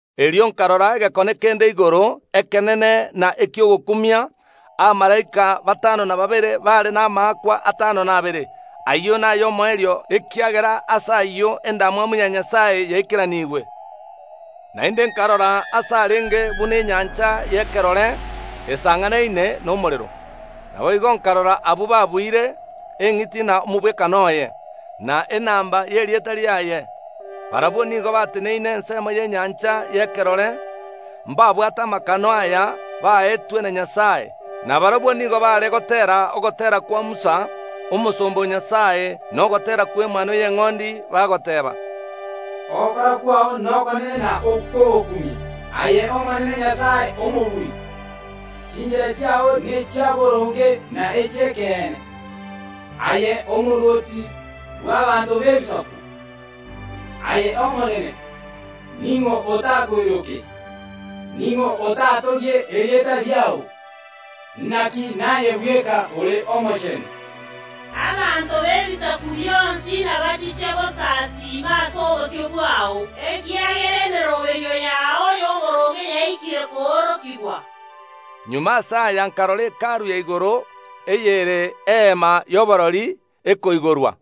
Erio nkarora egekone kende igoro, ekenene na eki’ogokumia. Abamalaika batano na babere baare namaakwa atano na abere, ayio nay’omoerio, ekiagera ase ayio endamwamu ya Nyasae yaikeranigwe. Naende nkarora aase arenge buna enyancha y’ekerore, esang’anaine nomorero. Naboigo nkarora abwo babuire eng’iti na omogwekano oye, na enamba y’erieta riaye. Barabwo nigo bateneine ensemo y’enyancha y’ekerore, mbabwate amakano aya baetwe na Nyasae. Na barabwo nigo baare goteera ogoteera kwa Musa, omosomba o Nyasae, na ogoteera kw’Emanwa y’Eng’ondi, bagoteeba, “Ogokora kwao nokonene na okw’ogokumia, aye Omonene Omobui! Chinchera chiao nechi’oboronge na echi’ekeene, aye omorwoti bw’abaanto b’ebisaku. Aye Omonene, ning’o otakoiroke? Ning’o otatogie erieta riao? Naki naye bweka ore omochenu. Abanto b’ebisaku bionsi nabachiche gosasiima ase obosio bwao, ekiagera emeroberio yao y’oboronge yaikire koorokigwa.” Magega ase aya nkarora Hekalu ya igoro, eyere Eema y’Oborori, ekoigorwa,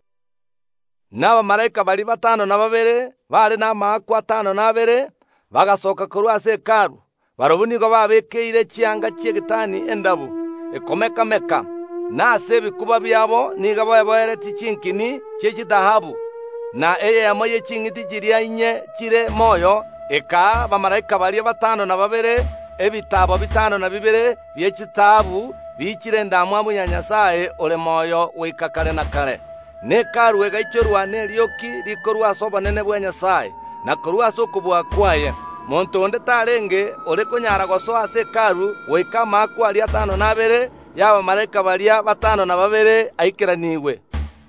na abamalaika baria batano na babere, abaare namaakwa atano na abere, bagasooka korwa ase Hekalu. Barabwo nigo babeekeire chianga chi’egatani endabu, ekomeka‐meka, na ase ebikuba biabo nigo beboeretie chinkini chi’echitaabu. Na eyemo ye ching’iti chiria inye chire moyo ekaa abamalaika baria batano na babere ebitaabo bitano na bibere bie chitaabu biichire endamwamu ya Nyasae ore moyo goika kare na kare. Na Hekalu egaichorwa nerioki rikorwa ase obonene bwa Nyasae, na korwa ase okobua kwaye; monto onde tarenge ore konyara gosoa ase Hekalu goika amaakwa aria atano na abere ay’abamalaika baria batano na babere aikeranigwe.